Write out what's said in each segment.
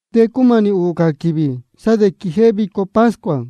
De cúmanī ūū cā quīvī sá de quijéhé vico pascua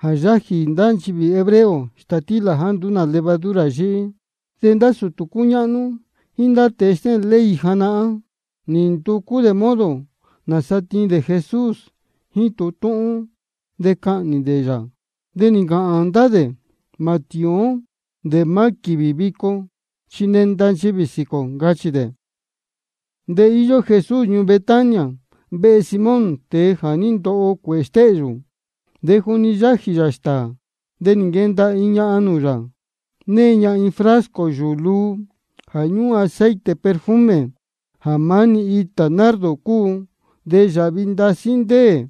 jā yájī ndá nchivī hebreo stātílā jāá nduú nā levadura yíhí. De ndá sūtū cúñáhnú jíín ndá tēe stéhēn ley janahán, nī nducú dē modo nāsa tiin dē Jesús jíín tūhun túhún, de cahnī dē yā. De nī ncāhān ndá dē: Mā tīín ó dē maá quīvī vico, chi nenda nchivī sīquī ō, ncachī dē. De íyó Jesús ñuū Betania, vehe Simón, tēe jā ní ndoho cuēhē stéhyū. De juni yájī yā stāā, de nī nquenda iin ñahan nūū yā, née ña iin frasco yūū luu jā ñúhún aceite perfume, jā maá-ni itā nardo cúu, de yāhvi ndasí ndéē.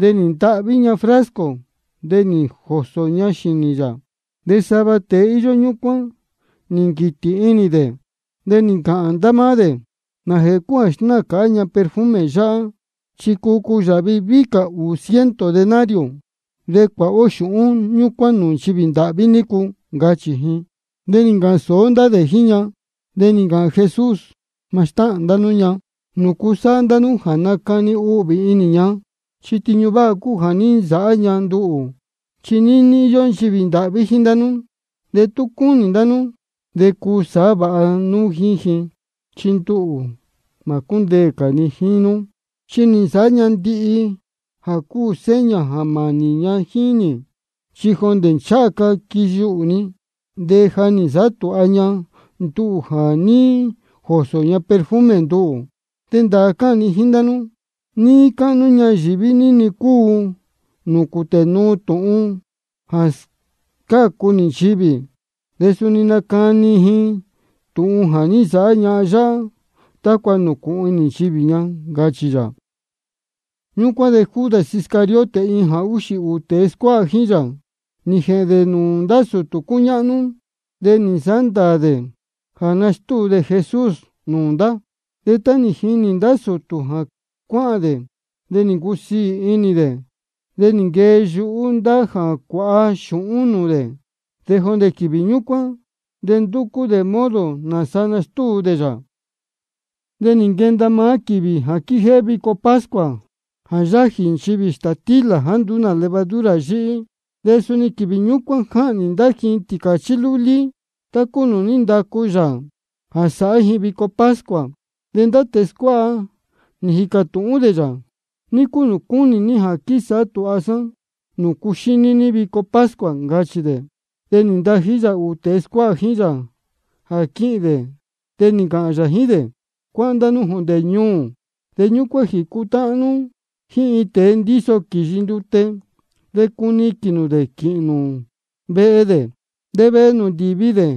De nī ntahví ña frasco, de nī jōsō ña xīnī yā. De sava tēe íyó ñúcuán nī nquītī inī dē, de nī ncāhān ndá máá dē: ¿Nājēhē cúu jā snáā cāhá ña perfume yáhá? Chi cuu cuyāhvi víhí cā ūnī ciento denario, de cuāha ó xūhún ñúcuán nūū nchivī ndāhví nícu, ncachī ji. De nī ncāhān sōó ndá dē jíín ña. De nī ncāhān Jesús: Mā stáhān ndá nú ña. ¿Nūcu sáhá ndá nú jā nacani uhvī inī ña? Chi iin tiñu váha cúu jā ní nsāhá ña nduhū. Chi níní íyó nchivī ndāhví jíín nú, de tú cúnī ndá nú de cuu sāhá vāha nú jíín ji. De nduhū chi mā cúndeē cā ni jíín nú. Chi nī nsāhá ña ndihi jā cuu sāhá ña jā mānī ña jíín nī. Chi jondē ncháha ca quiyuhū ni de ja nī nsāhá tūha ña nduhū jā ní jōsō ña perfume nduhū. De ndāā cáhān ni jíín ndá nú, níí cáhnú ñayīví ní-ni cúu nūū cūtē nuu tūhun jā scácu nī nchivī, de suni nacani ji tūhun jā ní nsāhá ñahan yáhá, tácua nūcūhun inī nchivī ña, ncachī yā. Ñúcuán de Judas Iscariote, iin jā úxī ūū tēe scuáha jíín yā, nī jēhēn dē nūū ndá sūtū cúñáhnú, de nī nsāhá ndāā dē jíín jā nastúu dē Jesús nūū ndá. De tá nī jini ndá sūtū jā cáhān dē, de nī ncusiī inī. De nī nquee yuhú ndá jā cuāha xūhún nūū dē. De jondē quīvī ñúcuán de ndúcú dē modo nāsa nastúu dē yā. De nī nquenda maá quīvī jā quíjéhé vico pascua jā yájī nchivī stātílā jāá nduú nā levadura yíhí, de suni quīvī ñúcuán jáhnī ndá ji tīcāchí lúlí tá cúu nūū ní ndacu Yāā Dios jā sāhá ji vico pascua. De ndá tēe scuáha nī jīcā tūhún dē yā: ¿Ní cúu nūū cúnī ní jā quísāhá tūha sá nūū cuxíní ní vico pascua? ncachī dē. De nī ntají yā ūū tēe scuáha jíín yā jā quíhīn dē, de nī ncāhān yā jíín dē: Cuáhán jondē ñuū, de ñúcuán jēcutáhán nú jíín iin tēe ndíso quīyi ndute. De cuniquīn nū dē quīhīn nū jíín dē. De vehe nūū ndīvi dē,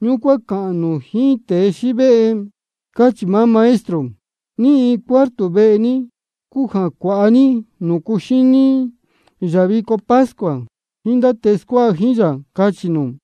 ñúcuán cāhān nū jíín tēe xívéhe: Cáchī maá Maestro: ¿Ní iin cuarto vehe ní cúu jā cuāha núú ní nūū cuxíní yā vico pascua jíín ndá tēe scuáha jíín yā? Cachī nū.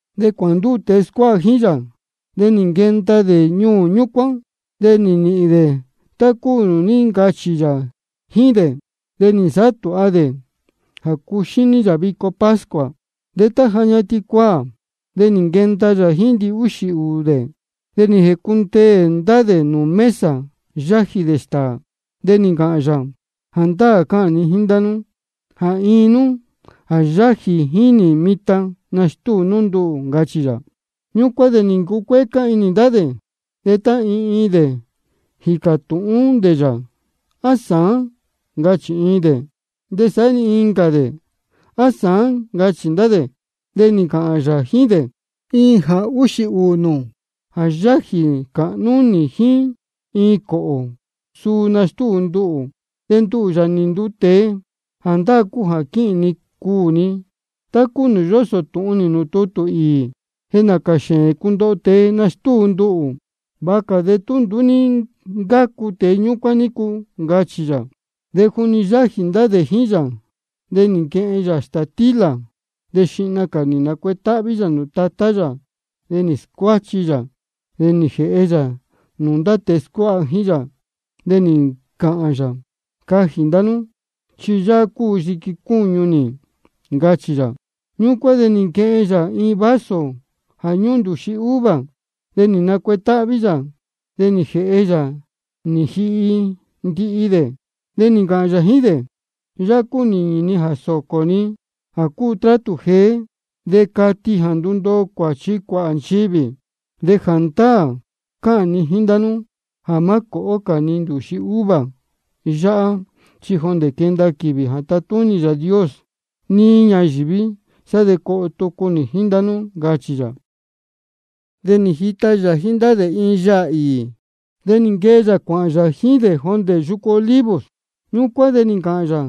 De cuāhān ndúū tēe scuáha jíín yā, de nī nquenda dē ñuū ñúcuán, de nī nīhīn dē tá cúu nūū ní ncachī yā jíín dē. De nī nsāhá tūha dē jā cuxíní yā vico pascua. De tá ja ñatin cuaā, de nī nquenda yā jíín ndihúxī ūū dē. De nī jēcundeē ndá dē nūū mesa yájī dē stāā, de nī ncāhān yā: Jāndáā cáhān ni jíín ndá nú jā iin nú jā yájī jíín nī mitan, nastúu nú nduhū, ncachī yā. Ñúcuán de nī ncucuécá inī ndá dē, de tá iin iin dē nī jīcā tūhún dē yā: ¿A sāán? ncachī iin dē. De saá-ni incā dē: ¿A sāán? ncachī ndá dē. De nī ncāhān yā jíín dē: Iin jā úxī ūū nū jā yájī cāhnú jíín nī iin cōhō, suu nastúu nduhū. De nduhū, Yāā nī nduu tēe, jāndáā cúu jā quīhīn ni cuū ni, tá cúu nūū yósō tūhun nī nūū tutū īī. De nācā xēēn cundoho tēe jā nastúu nduhū. Vāha cā de tú nduú ní ncácu tēe ñúcuán nícu, ncachī yā. De juni yájī ndá dē jíín yā, de nī nquehen yā stātílā, de xihna cā nī nacuetáhví yā nūū Tatá yā, de nī scuáchi yā, de nī jēhe yā nūū ndá tēe scuáha jíín yā. De nī ncāhān yā: Cajī ndá nú, chi yáhá cúu yiqui cúñu nī, ncachī yā. Ñúcuán de nī nquehen yā iin vaso jā ñúhún ndūxi uva, de nī nacuetáhví yā, de nī jēhe yā nī jihi ndihi dē. De nī ncāhān yā jíín dē: Yáhá cúu nīñī ni jā sōcō ni jā cúu trátū jeé, de cati jā ndundoo cuāchi cuāhā nchivī. De jāndáā cáhān ni jíín ndá nú jā má cōhó cā ni ndūxi uva yáhá, chi jondē quenda quīvī jā tatúnī Yāā Dios níí ñayīví, sá de coho tucu nī jíín ndá nú, ncachī yā. De nī jita yā jíín ndá dē iin yaā īī. De nī nquee yā cuāhān yā jíín dē jondē yucu Olivos. Ñúcuán de nī ncāhān yā: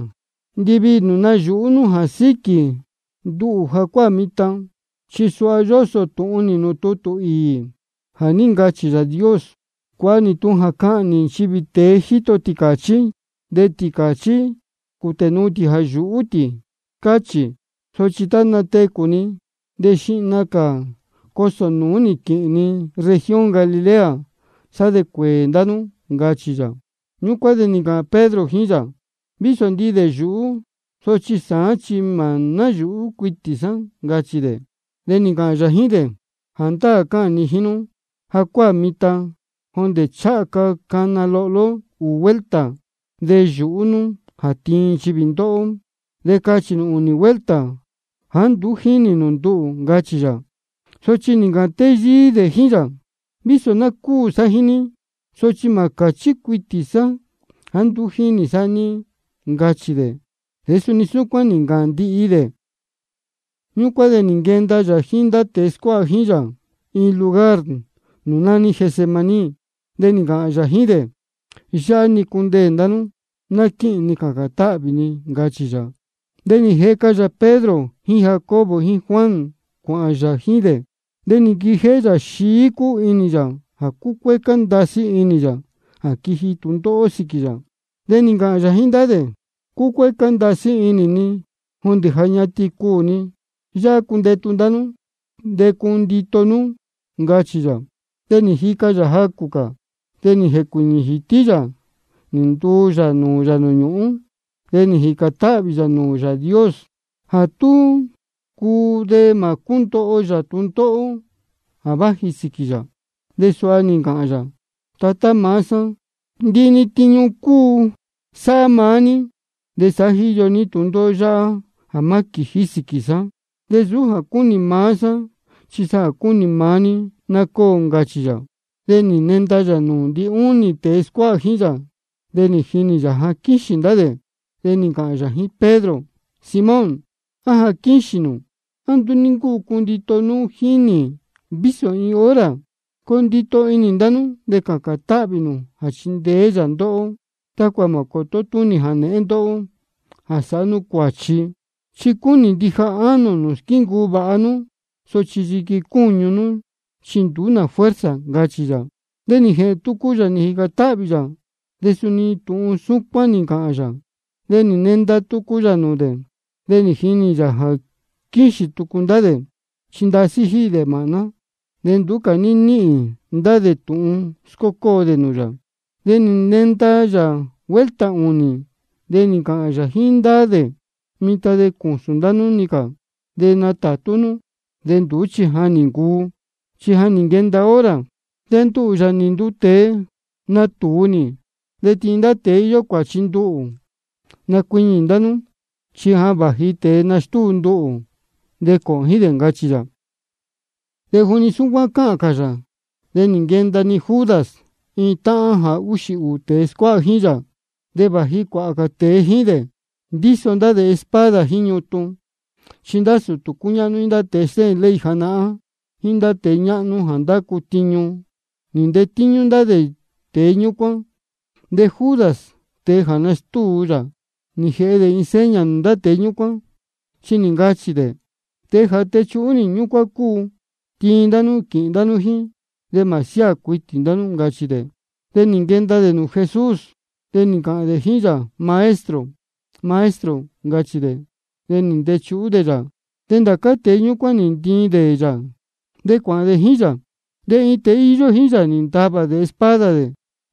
Ndiviī nū nayūhú nú jā síquī nduhū jacuáā mitan. Chi suha yósō tūhun nī nūū tutū īī jā ní ncachī Yāā Dios: Cuāha nī tūhun jā cahnī nchivī tēe jíto tīcāchí, de ndá tīcāchí cūtē nuu tī jā yúhú tī, cáchī. Sochi tá natecū ni, de xihna cā ni cosō nūú quīhīn ni región Galilea, de sá de cuēē ndá nú, ncachī yā. Ñúcuán de nī ncāhān Pedro jíín yā: Vísō ndihi dē nayūhú dē, sochi sāán chi mā náyūhú cuitī sá, ncachī dē. De nī ncāhān yā jíín dē: Jāndáā cáhān ni jíín nú, jacuáā mitan jondē ncháha ca cana lohló ūū vuelta, de yūhú nú jā tiin nchivī ndóhó, de cachī nū ūnī vuelta jāá nduú jínī nū nduhū, ncachī yā. Sochi nī ncāhān téyíí dē jíín yā: Vísō ná cúū sá jíín ní, sochi mā cāchí cuitī sá jāá nduú jínī sá ní, ncachī dē. De suni súcuán nī ncāhān ndihi dē. Ñúcuán de nī nquenda yā jíín ndá tēe scuáha jíín yā iin lugar nūū nání Getsemaní. De nī ncāhān yā jíín dē: Yáhá-ni cundeē ndá nú de ná quíhīn ni cācān táhvī ni, ncachī yā. De nī jeca yā Pedro jíín Jacobo jíín Juan cuāhān yā jíín dē. De nī nquijéhé yā xií cúu inī yā de cúcuécá ndasí inī yā jā quiji tūndóhó sīquī yā. De nī ncāhān yā jíín ndá dē: Cúcuécá ndasí inī ni jondē ja ñatin cuū ni. Yáhá cundetu ndá nú de cundito nú, ncachī yā. De nī jica yā jacū cā, de nī jēcuīñī jītí yā nī ntuu yā nūū yā nūū ñūhún. De nī jīcān táhvī yā nūū Yāā Dios jā tú cuu de mā cúndoho yā tūndóhó jā váji sīquī yā. De suha nī ncāhān yā: Tatá maá sá, ndihi-ni tiñu cuu sāhá maá ní. De sāhá jíyo ní tūndóhó yáhá jā má quījí sīquī sá. Sochi nsūú jā cúnī maá sá, chi jā cúnī maá ní ná cóo, ncachī yā. De nī nenda yā nūū ndinúnī tēe scuáha jíín yā, de nī jinī yā jā quíxīn ndá dē. De nī ncāhān yā jíín Pedro: Simón, ¿á jā quíxīn nū? ¿A nduú ní ncúu cundito nú jíín nī vísō iin hora? Coo ndito inī ndá nú de cācān táhvī nū jā chindeé yā ndóhó tácua mā cōtó túnī jānēhén ndóhó jā sāhá nú cuāchi. Chi cúnī ndija ánō nū squíncuu vāha nú, sochi yiqui cúñu nú chi nduú fuerza, ncachī yā. De nī jēhēn tucu yā, nī jīcān táhvī yā, de suni tūhun ñúcuán nī ncāhān yā. De nī nenda tucu yā nūū dē, de nī jinī yā jā quíxīn tucu ndá dē, chi ndasí jíhī dē māhná. De nduú cā ní níhīn ndá dē tūhun scócóo dē nūū yā. De nī nenda yā vuelta ūnī, de nī ncāhān yā jíín ndá dē: Mitan de cūsūn ndá nú-ni cā de natātú nú. De nduú chi ja nī ncuu, chi ja nī nquenda hora, de nduhū, Yāā nī nduu tēe, natūu nī de tiin ndá tēe íyó cuāchi nduhū. Nacuiñī ndá nú, chi ja vāji tēe nastúu nduhū, de cōhōn jíín dē, ncachī yā. De juni súcuán cáhān cā yā, de nī nquenda-ni Judas, iin táhán jā úxī ūū tēe scuáha jíín yā. De vāji cuāhā tēe jíín dē, ndíso ndá dē espada jíín ñutun. Chi ndá sūtū cúñáhnú jíín ndá tēe stéhēn ley janahán jíín ndá tēe ñáhnú jā ndácu tiñu, nī ntetíñú ndá tēe ñúcuán. De Judas, tēe jā nastúu yā, ja nī jēhe dē iin seña nūū ndá tēe ñúcuán, chi nī ncachī dē: Tēe jā techuhú nī, ñúcuán cúu. Tiin ndá nú quīhīn nū jíín, de mā siáā cuitī nū, ncachī dē. De nī nquenda dē nūū Jesús, de nī ncāhān dē jíín yā: Maestro, Maestro, ncachī dē. De nī ntechuhú dē yā. De ndá cā tēe ñúcuán nī ntiin dē yā, de cuāhān dē jíín yā. De iin tēe íyó jíín yā nī ntavā dē espada dē,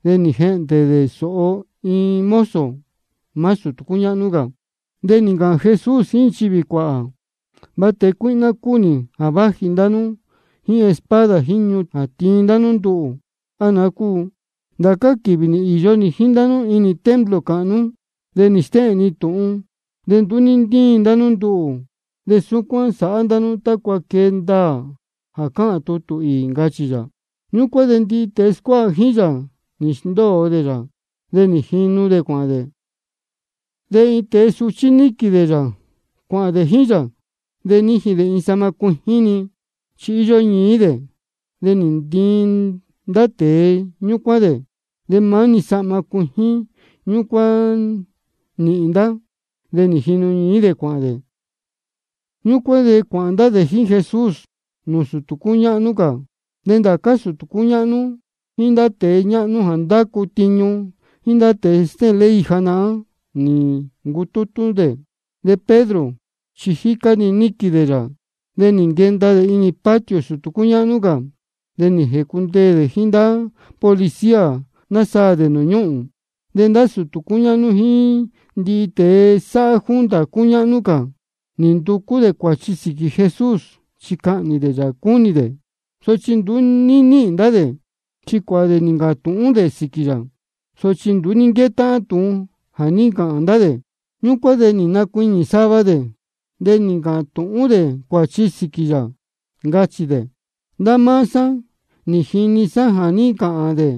de nī jehndē dē sōho iin mozo maá sūtū cúñáhnú cā. De nī ncāhān Jesús jíín nchivī cuāhā: ¿De va tēe cuíhná cúu nī jā váji ndá nú jíín espada jíín ñutun jā tiin ndá nú nduhū, á naá cúu? Ndācá quīvī nī īyo nī jíín ndá nú inī templo cāhnú, nī stéhēn ni tūhun, de nduú ní ntíin ndá nú nduhū. De súcuán sáhá ndá nú tácua quee ndaā jā cáhān tutū īī, ncachī yā. Ñúcuán de ndihi tēe scuáha jíín yā, nī sndóo dē yā, de nī jinu dē cuāhān dē. De iin tēe suchí níquīn dē yā cuāhān dē jíín yā. De níjin dē iin sahma cuijín-ni, chi íyó ñií dē. De nī ntiin ndá tēe ñúcuán dē. De maá-ni sahma cuijín ñúcuán nī nīhīn ndá. De nī jinu ñií dē cuāhān dē. Ñúcuán de cuāhān ndá dē jíín Jesús nūū sūtū cúñáhnú cā. De ndācá sūtū cúñáhnú jíín ndá tēe ñáhnú jā ndácu tiñu jíín ndá tēe stéhēn ley janahán, nī ncutútú dē. De Pedro chi jícá-ni níquīn dē yā, de nī nquenda dē inī patio sūtū cúñáhnú cā. De nī jēcundeē dē jíín ndá policía, násaā dē nūū ñúhūn. De ndá sūtū cúñáhnú jíín ndihi tēe sáhá junta cúñáhnú cā, nī nducú dē cuāchi sīquī Jesús, chi cahnī dē yā cúnī dē. Sochi nduú ní níhīn ndá dē. Chi cuāhā dē nī ncāhān tūhún dē sīquī yā, sochi nduú ní nquétáhán tūhun jā ní ncāhān ndá dē. Ñúcuán de nī nacuiñī sava dē, de nī ncāhān tūhún dē cuāchi sīquī yā, ncachī dē: Ndá máá sá nī jini sá jā ní ncāhān dē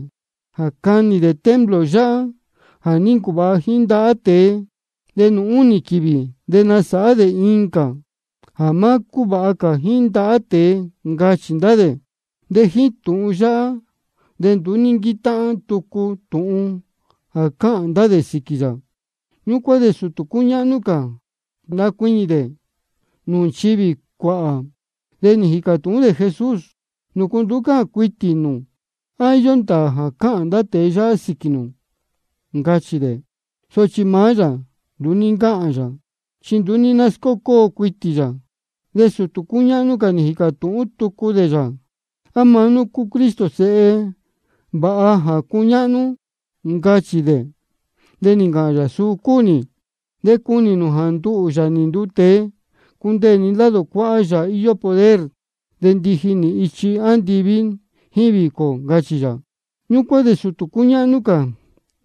jā canī dē templo yáhá jā ní ncuvāha jíín ndahá tēe, de nūū únī quīvī de nasāhá dē incā jā má cúvāha jíín ndahá tēe, ncachī ndá dē. De ni jíín tūhun yáhá de nduú ní nquétáhán tucu tūhun jā cáhān ndá dē sīquī yā. Ñúcuán de sūtū cúñáhnú cā nī nacuiñī dē nūū nchivī cuāhā, de nī jīcā tūhún dē Jesús: ¿Nūcu nduú cáhān cuitī nū? ¿A íyó ndāā jā cáhān ndá tēe yáhá sīquī nū? ncachī dē. Sochi maá yā nduú ní ncáhān yā, chi nduú ní náscócóo cuitī yā. De sūtū cúñáhnú cā nī jīcā tūhún tucu dē yā: ¿A maá nú cúu Cristo, Sēhe Yāā vāha jā cúñáhnú? ncachī dē. De nī ncāhān yā: Suu cúu nī. De cunī nū jā nduhū, Yāā nī nduu tēe, cundeē ni lado cuáhá Yāā íyó poder, de ndiji nī ichi andiví jíín vīcō, ncachī yā. Ñúcuán de sūtū cúñáhnú cā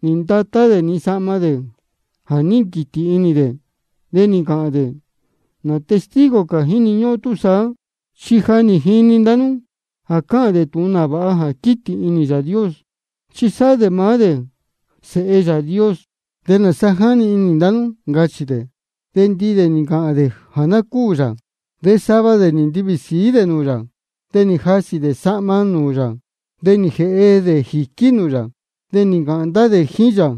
nī ndatá dē-ni sahma dē jā ní nquītī inī dē, de nī ncāhān dē: ¿Nā testigo cā jíni ñúhún ó túsaá? Chi ja nī jini ndá nú jā cáhān dē tūhun nāvāha jā quītī inī Yāā Dios, chi sáhá dē maá dē Sēhe Yāā Dios. ¿De nāsa jáni inī ndá nú? ncachī dē. De ndihi dē nī ncāhān dē jā ná cúū yā. De sava dē nī ntivī sīí dē nūū yā, de nī jasī dē sahma nūū yā, de nī jēhe dē jīquí yā, de nī ncāhān ndá dē jíín yā: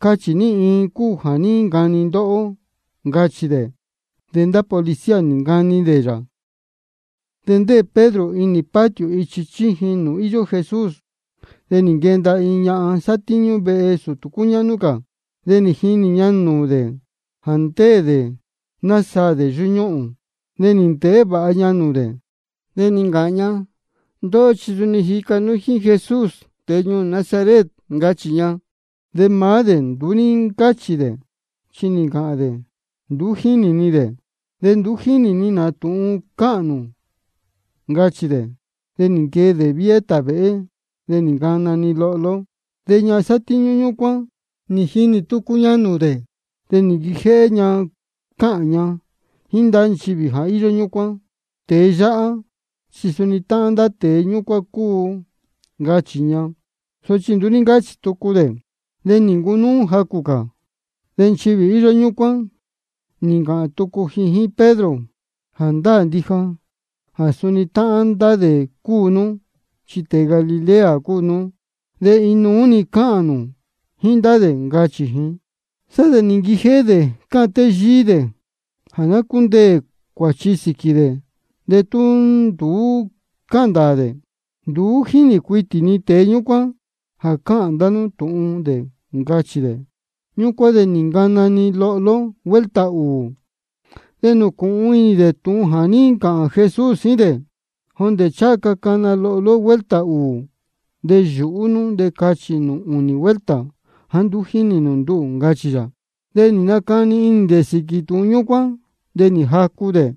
Cachī ní iin cúu jā ní ncani ndóhó, ncachī dē. De ndá policía nī ncani dē nūū yā. De ndéē Pedro inī patio ichi chíjin nūū íyó Jesús. De nī nquenda iin ñahan sátíñú vehe sūtū cúñáhnú cā. De nī jinī ña nūū dē jā ndéē dē násaā dē yúñúhūn. De nī ndēhé vāha ña nūū dē, de nī ncāhān ña: Ndóhó chi suni nī jica nú jíín Jesús, tēe ñuū Nazaret, ncachī ña. De maá dē nduú ní ncáchī dē, chi nī ncāhān dē: Nduú jínī ni dē, de ni nduú jínī ni nā tūhun cáhān nū, ncachī dē. De nī nquee dē viéhé tāvēhé, de nī ncana-ni lohló. De ñahan sátíñú ñúcuán, nī jinī tucu ña nūū dē, de nī nquijéhé ña cáhān ña jíín ndá nchivī jā íyó ñúcuán: Tēe yáhá chi suni táhán ndá tēe ñúcuán cúu, ncachī ña. Sochi nduú ní ncáchī tucu dē. De nī ncunúú jacū cā, de nchivī íyó ñúcuán nī ncāhān tucu ji jíín Pedro: Jāndáā ndija jā suni táhán ndá dē cúu nú, chi tēe Galilea cúu nú, de iin nuú-ni cáhān nū jíín ndá dē, ncachī ji. Sá de nī nquijéhé dē cáhān téyíí dē jā ná cúndeē cuāchi sīquī dē de tú nduú cáhān ndāā dē: Nduú jínī cuitī ni tēe ñúcuán jā cáhān ndá nú tūhun dē, ncachī dē. Ñúcuán de nī ncana-ni lohló vuelta ūū. De nī nūcūhun inī dē tūhun jā ní ncāhān Jesús jíín dē: Jondē tá ncháha ca cana lohló vuelta ūū, de yūhú nú de cachī nū ūnī vuelta jāá nduú jínī nū nduhū, ncachī yā. De nī nacani inī dē sīquī tūhun ñúcuán, de nī jacu dē.